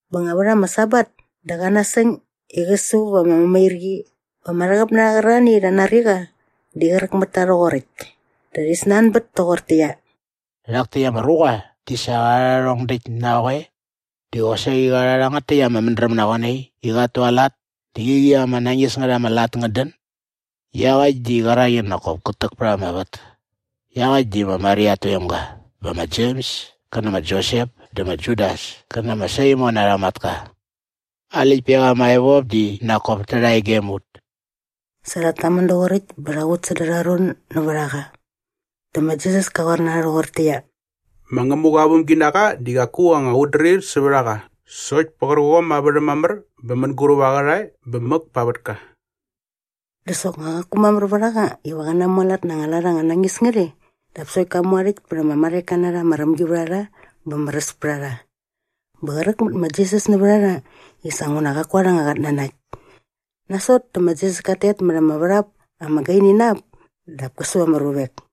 Bä nga vät ama Sabat dä qa nasäng i qä su va ama mämairqi bä ama rhäqäp na rha qärarhani i rha nari qa di qräk mät ta rhoqoräkt. Dä rhi snanbät toqortäqyia, “Rhak täkt ama ruqa di sa qa rha rhärhong däkt na qoe? Dä qosaqi qa rha rhangät täkt ama mädräm na qoe nai i qat tualat dä qäqi ama nañis ngät ama lat ngät dän? Iaqäkt di qärak i nak kop kät täk pät ama vät. Iaqäkt di ma Maria at toemga bä ma Jems kä nä ma Josep dä ma Judas kä nä ma Saimon arha matka. Aa läktpek ama evop di nak kop tärha e gem ut.” Sa rhat tamän doqoräkt bä rha qut säda arha ron nävät a qa. Dä ma Jisas ka qoar na rha rhoqortäqyia, “Ma Ngämuqa aa vämginaqa di qaku anga qutdrir sävät a qa sokt pä qärqom aa värhäm mamär bä mänguräp aa qärhae bä mäk pa aa vätka.” Dä soknga qaku mamär vät a qa iva qä namualat na anga lat anga nañis ngät e dap sokt ka mu aa rhäkt pät ama marheka na rha ama rämgivärharha bä märäs pät a rha. Bä qräk mät ma Jisas nävät a rha i sa nguna qaku arha anga qatnanakt. Nasot dä ma Jisas kat tet mät ama värhap ama gaini na ap dap kä su ama ruvek.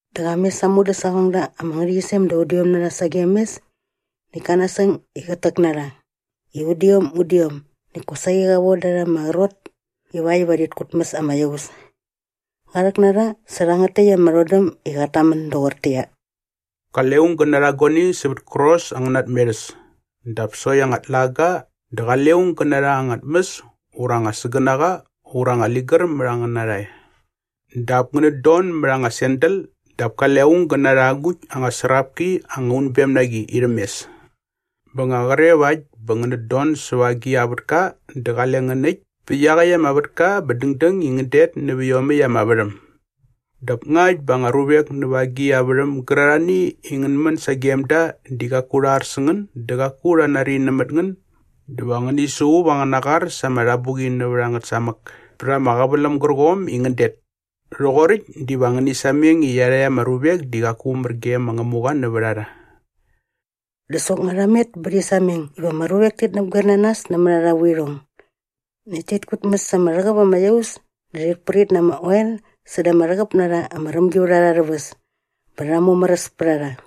Dä qa mes aa mudäsaqongda ama ngärhäqyisem da udiom na rha sagem mes näkt ka nasäng i qät täk na rha i udiom udiom näkt kosaqi qa voda rha ama qrot ivakt iva rhit kutmäs ama iaus. Qa rhäk na rha sä rhangät täkt ama rhodäm i qat tamän doqortäqyia, “Qale aung gä narha guani sävät kärqos angäna tmerhäs dap sokt anga tlaga dä qale aung gä narha anga tmäs ura anga sägänaqa ura anga ligär mät angäna rhae. Dap ngänät don mät anga sandal dap kale aung gä narha agukt anga srapki anga unbem na qi irhäm mes. Bä nga qre vakt bä ngänät don säva agi a vätka dä qale ngän äkt pä iaqäkt ama vätka bä dängdäng i ngän det nävä iomäkt ama värhäm. Dap ngakt bä anga ruvek näva agi a värhäm gärarhani i ngän män sagem da di qaku rha ar sä ngän dä qaku rha nari nämät ngän dä va ngäni suqup angäna qar sa ama rhabuqi nävät ngät samäk pät ama qäväläm gärqom i ngän det. Rhoqoräkt diva ngäni sameng i iarhakt ama ruvek di qaku mär ge ma Ngämuqa nävät a rha.” Dä soknga rha met bä rhi sameng iva ama ruvek ti näpgoer na nas nämät arha vuirhong. Näkt tit kutmäs ama rhäqäp ama iaus dä rhit prit na ama oel säda ama rhäqäp na rha ama rämgivärharha arhä väs bä rha mumäräs pät a rha.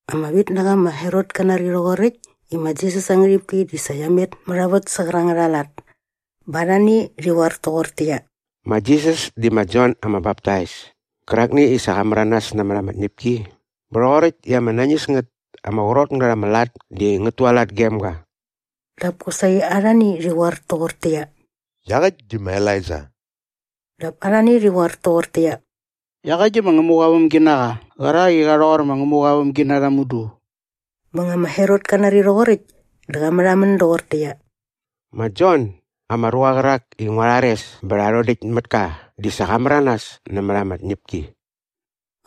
Ama vitnaqa ma Herot ka nari rhoqoräkt i ma Jisas aa ngärhipki di sa qia met mät a vät sä qärangät aa lat. Bä arhani rhi qoar toqortäqyia, “Ma Jisas di ma Jon ama Baptais kärakni i sa qa märanas nämät ama tñäpki bä rhoqoräkt i ama nañis ngät ama qrot ngät ama lat di ngät tualat gem ga.” Dap kosaqi arhani rhi qoar toqortäqyia, “Iaqäkt di ma Elaija.” Dap arhani rhi qoar toqortäqyia, “Iaqäkt di ma Ngämuqa aa vämginaqa qärak i qa rhoqor ma Ngämuqa aa vämginarha mudu.” Bä nga ma Herot ka nari rhoqoräkt dä qa märhamän doqortäqyia, “Ma Jon, ama ruqa qärak i ngua rhares bä rha rhodäkt mät ka di sa qa märanas nämät ama tñäpki!”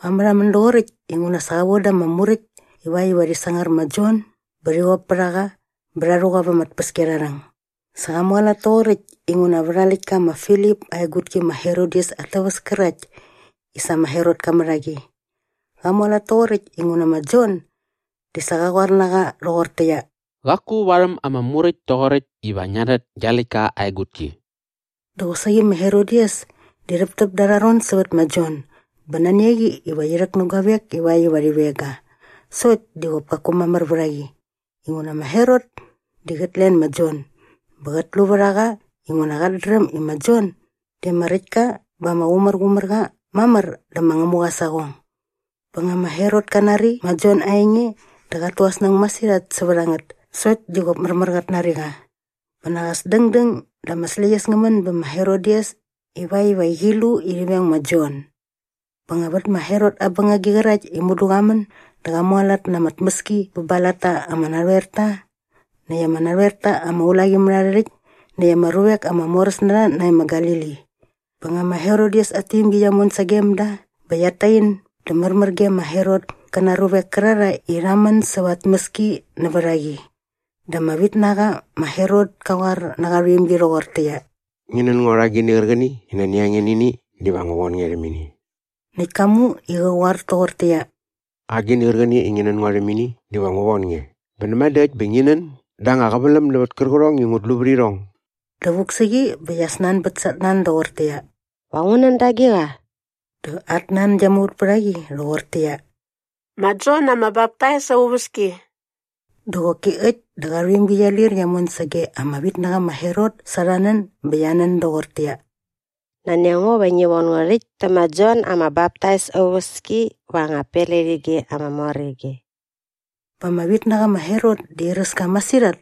Qa märhamän doqoräkt inguna sa qa voda rha ama muräkt ivakt iva rhi sangar ma Jon bä rhi qop pät a qa bä rha rhu qa va ama tpäskiarharhäng. Sa qa mualat toqoräkt inguna vät aa läktka ma Filip aa egutki ma Herodias at täväs kärakt i sa ma Herot ka mät a qi. Qa mualat toqoräkt inguna ma Jon di sa qa qoar na qa rhoqortäqyia, “Qaku varhäm ama Muräkt toqoräkt iva ngia rhät gia läktka aa egutki.” Dä qosaqi ma Herodias di rhäptäp da arha ron sävät ma Jon bä nani a qi iva qi rhäk nä guavek ivakt iva rhi veng ga sokt di qop kaku mamär vät a qi inguna ma Herot di qät len ma Jon bä qät lu vät a qa inguna qat dräm i ma Jon di ama räkt ka bä ama qumärqumär qa mamär dä ma Ngämuqa aa saqong. Bä nga ma Herot kat nari ma Jon aa enge dä qat tu aa snäng masirhat sävät a ngät sokt di qop märmär qat nari qa. Bä nak as dängdäng dä ama släqyäs ngä män bä ma Herodias ivakt iva qi lu i rhi veng ma Jon. Bä nga vät ma Herot aa bängagi qärakt i mudu qa män dä qa mualat na ama tmäski bä ba aa latta ama narhoerta näkt ama narhoerta ama ulaqimärharhärhäkt näkt ama ruvek ama moräs na rha nae ma Galili. Bä nga ma Herodias at tuimgi qia mon sagem da bä qiat tain dä märmär ge ma Herot kä na aa ruavek kärarhae i rha män säva aa tmäski nävät a qi. Dä ama vitnaqa ma Herot ka qoar nä qa rhuimgi rhoqortäqyia, “Ngi nän ngo rha agini qärqäni i nani a nge nä ini dä va ngu von nge rhäm ini.” Näkt ka mu i qä qoar toqortäqyia, “Agini qärqäni i ngi nän ngo rhäm ini diva ngu von nge bä näma dä äkt bä ngi nän da anga qäväläm nävät kärqärhong i ngut lu vät irhong.” Dä vuk sä qi bä qia snanbät sa at nan doqortäqyia, “Va ngu nän da agiqa?” Dä at nan gia muvät pät a qi rhoqortäqyia, “Ma Jon ama Baptais aa uväski.” Dä qoki äkt dä qa rhuimgi qia lir qia mon sage ama vitnaqa ma Herot sa arha nän bä qia nän doqortäqyia, “Nani a ngo iva ngi von ngo rhäkt tä ma Jon ama Baptais aa uväski va anga pletige ama mor ige.” Bä ama vitnaqa ma Herot di airäs ka masirhat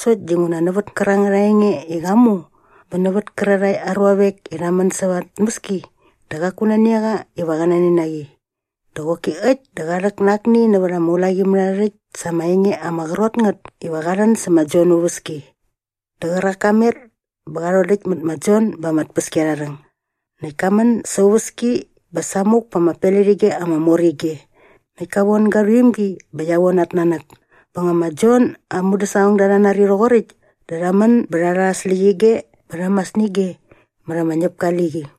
sokt dinguna nävät kärangät aa enge i qa mu bä nävät kärarhae aa ruavek i rha män säva aa tmäski dä qaku nani a qa iva qä nen na qi. Dä qoki äkt dä qa rhäk na akni nävät aa ulaqimärharhärhäkt sa ama enge ama qrot ngät iva qa rhän sä ma Jon aa uväski. Dä qärak ka met bä qa rhodäkt mät ma Jon ba ama tpäskiarharhäng. Näkt ka män sa aa uväski bä samuk pa ama pletige ama mor ige. Näkt ka von ga rhuimgi bä qia von at nanäk. Bä nga ma Jon aa mudäsaqongda rha nari rhoqoräkt dä rha män bä rha rha aa släqyige bä rha mas nä ige mät ama ñäpka aa liqi.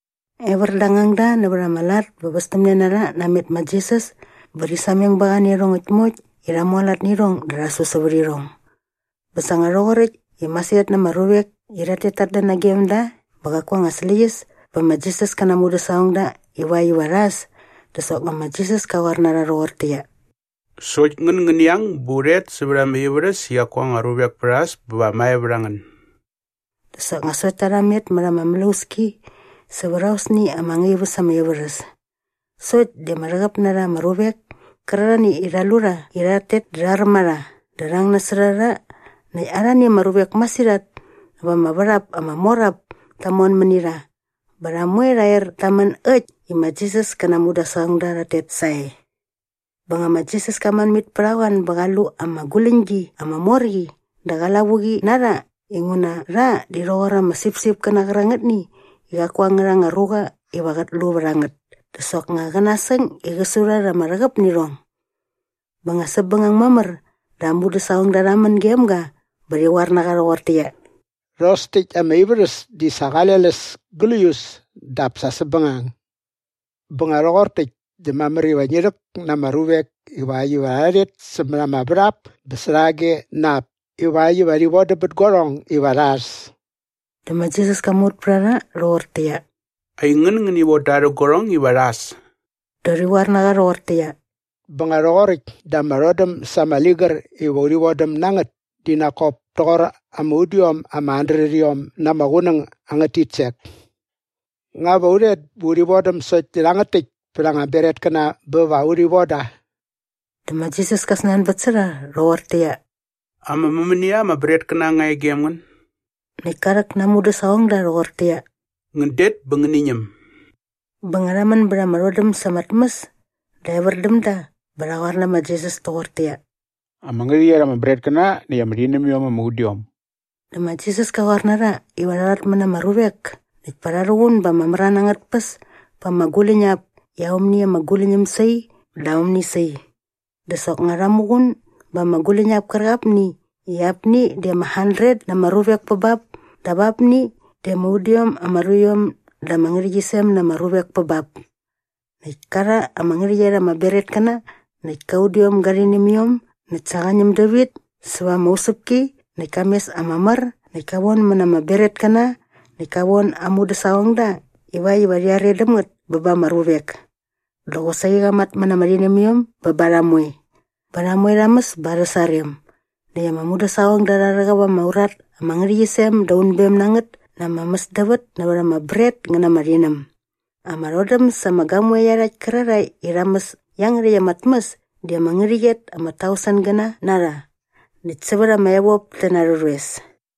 Evär da ama ngangda nävät arha lat bä västämne na rha namet ma Jisas bä rhi sameng ba qa nä iarhongäkt moekt i rha mualat nä irhong dä rha su sävät irhong. Bä sa nga rhoqoräkt i masirhat na ama ruvek i rhat tet tat dän nagem da bä qaku anga släqyäs bä ma Jisas kä na aa mudäsaqongda ivakt iva rha äs dä soknga ma Jisas ka qoar na rha rhoqortäqyia, “Sokt ngän ngäni ang bä u rhet sävät anga ivärhäs i qaku anga ruvek pät a äs bä va mae vät a ngän.” Dä soknga sokt ta rha met mät ama mlauski sävät aosni ama ngaip äs ama ivärhäs. Sokt di ama rhäqäp na rha ama ruvek kärarhani i rha lu rha i rhat tet di rha räm a rha dä rha ang nasot a rha näkt arhani ama ruvek masirhat näva ama värhap ama mor ap ta mon mäni rha bä rha moe rha er ta män äkt i ma Jisas kä na aa mudäsaqongda rhat tet sae. Bä nga ma Jisas ka män mit pät a qoan bä qa lu ama guläñgi ama mor qi dä qa lavuqi na rha inguna rha di rha rhoqor ama sipsipkäna qärangätni i qaku angärha anga ruqa iva qät lu vät a ngät dä soknga qä nasäng i qä su rha rha ama rhäqäp nä irhong. Bä nga säpbängang mamär dä aa mudäsaqongda rha män gem ga dä rhi qoar na qa rhoqortäqyia, “Rhos täkt ama ivärhäs di sa qale läs gläius dap sa säpbängang. Bä nga rhoqor täkt dä mamär iva ngi rhäk na ama ruvek ivakt iva rha rhet sämät ama värhap bä särhage na ap ivakt iva rhi vodäm bät guarhong iva rha äs.” Dä ma Jisas ka muvät pät a rha rhoqortäqyia, “Aingän ngäni von da rhä guarhong iva rha äs.” Dä rhi qoar na qa rhoqortäqyia, “Bä nga rhoqoräkt dä ama rhodäm sa ama ligär iva urhi vodäm na ngät di nak kop toqor ama udiom ama handretiom na ama qunäng angät titsek! Nga va u rhet bä urhi vodäm sokt nä rhangät täkt pät anga bretkäna bä va urhi von da?” Dä ma Jisas ka snanbät sä rha rhoqortäqyia, “Ama mämänia ama bretkäna nga e gem ngän?” Näkt ka rhäk na aa mudäsaqongda rhoqortäqyia, “Ngän det bä ngäni ñäm.” Bä nga rha män bät ama rhodäm sa ama tmäs dä evär däm da bä rha qoar nä ma Jisas toqortäqyia, “Ama ngärhäqyet ama bretkäna näkt ama rhinämiom ama udiom.” Dä ma Jisas ka qoar na rha iva rha rhatmät na ama ruvek näkt pa rha rhuqun ba ama mran angät tpäs pa ama guläñap i aomni ama guläñäm sai dä aomni sai. Dä soknga rha muqun ba ama guläñap kärqapni i apni di ama handret na ama ruvek pä bap dap apni di ama udiom ama ruiom da ama ngärhäqyisem na ama ruvek pä bap. Näkt ka rha ama ngärhäqyet ama bretkäna näkt kä udiom gä rhinämiom näkt sa qa ñäm dävit säva ama usäpki näkt ka mes ama mär näkt ka vonmät na ama bretkäna näkt ka von aa mudäsaqongda ivakt iva rhi are däm ngät bä ba ama ruvek. Dä qosaqi qa matmät na ama rhinämiom bä ba rha moe. Bä rha moe rha mäs bä arhä sarem. Näkt ama mudäsaqongda rha rhäqäp ama urat ama ngärhäqyisem dä unbem na ngät na ama mäsdävät nävät ama bret ngä na ama rhinäm. Ama rhodäm sa ama gamoe iarhakt kärarhae i rha mäs iangärhäkt ama tmäs di ama ngärhäqyet ama tausengäna na rha näkt sävät ama evop ti na ama rhoes.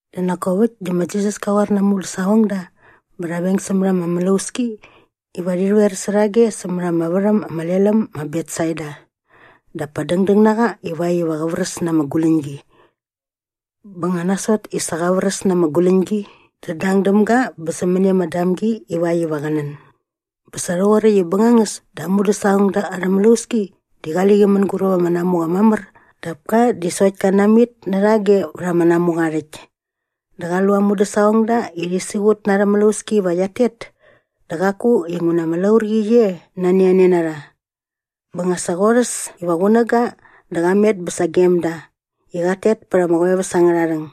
Dä nak kop äkt dä ma Jisas ka qoar na aa mudäsaqongda bä rha veng sämät ama mlauski iva rhi rhoer särhage sämät ama värhäm ama lel äm ma Betsaida dap pa dängdäng na qa ivakt iva qä vräs na ama guläñgi. Bä nga nasot i sa qa vräs na ama guläñgi dä dang däm ga bä sämäni ama damgi ivakt iva qä nän. Bä sa rhoqoräkt i bängangäs dä aa mudäsaqongda arhä mlauski di qali qi mänguräp ama namuqa mamär dap ka di sokt ka namit närhage vät ama namuqa aa rhäkt. Dä qa lu aa mudäsaqongda i rhi siqut na arhä mlauski iva qiat tet dä qaku inguna ama laurqi qi e nani a ne na rha. Bä nga sa qorhäs iva qunäga dä qa met bä sagem da i qat tet pät ama qoeväs angärha rhäng.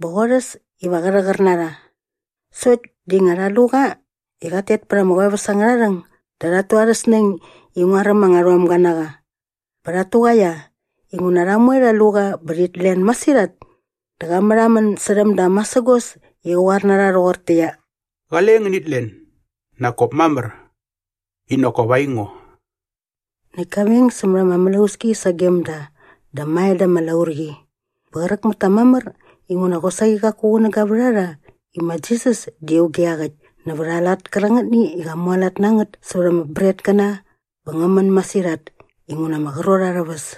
Bä qorhäs iva qä rhäqär na rha. Sokt di nga rha lu qa i qat tet pät ama qoeväs angärha rhäng dä rhat tu arhä snäng i nguaräm anga rhomga na qa. Bä rhat tuqaia inguna rha moe rha lu qa bä rhit len masirhat. Dä qa märhamän särhäm da masägos i qä qoar na rha rhoqortäqyia, “Qale ngänit len! Nak kop mamär. I nak kop aingo.” Näkt ka veng sämät ama mlauski sagem da dä mae da ama laurqi. Bä qräk mät ta mamär inguna qosaqi qaku qunäga vät a rha i ma Jisas di auge iaqäkt nävät aa lat kärangätni i qa mualat na ngät sävät ama bretkäna bä ngä män masirhat inguna ama qrot arhä väs.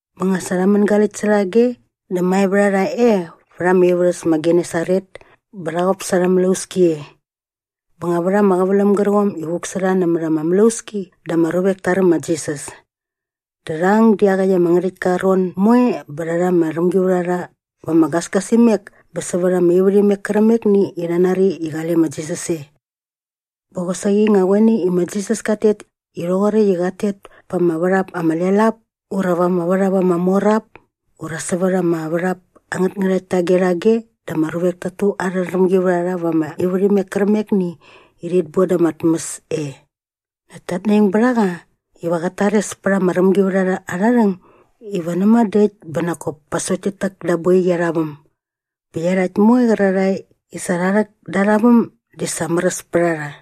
Bä nga sa rha mängaläkt särhage dä mae vät a rha e vät ama ivärhäs ma Genesaret bä rha qop sa arhä mlauski e. Bä nga vät ama qäväläm gärqom i vuk sä rha nämät ama mlauski dä ama ruvek ta räm ma Jisas. Dä rha ang dä iaqäkt ama ngärhäktka aa ron moe bä rha rha ama rämgivärharha va ama gasgasimek bä sävät ama ivärhimek kärqämekni i rha nari i qale ma Jisas e. Bä qosaqi nga qoe nai i ma Jisas kat tet i rhoqoräkt i qat tet pa ama värhap ama lel ap ura va ama värhap ama mor ap ura sävät ama värhap angät ngärhakt tage rhage dä ama ruvek tat tu arha rämgivärharha va ama ivärhimek kärqämekni i rhit boda ama tmäs e. Näkt tat naing bät a qa iva qät tares pät ama rämgivärharha arha rhäng iva näma dä äkt bä nak kop pa sokt tit täk da aa boiqi arha väm. Bä iarhakt moe qärarhae i sa rha rhäk da arha väm di sa märäs pät a rha.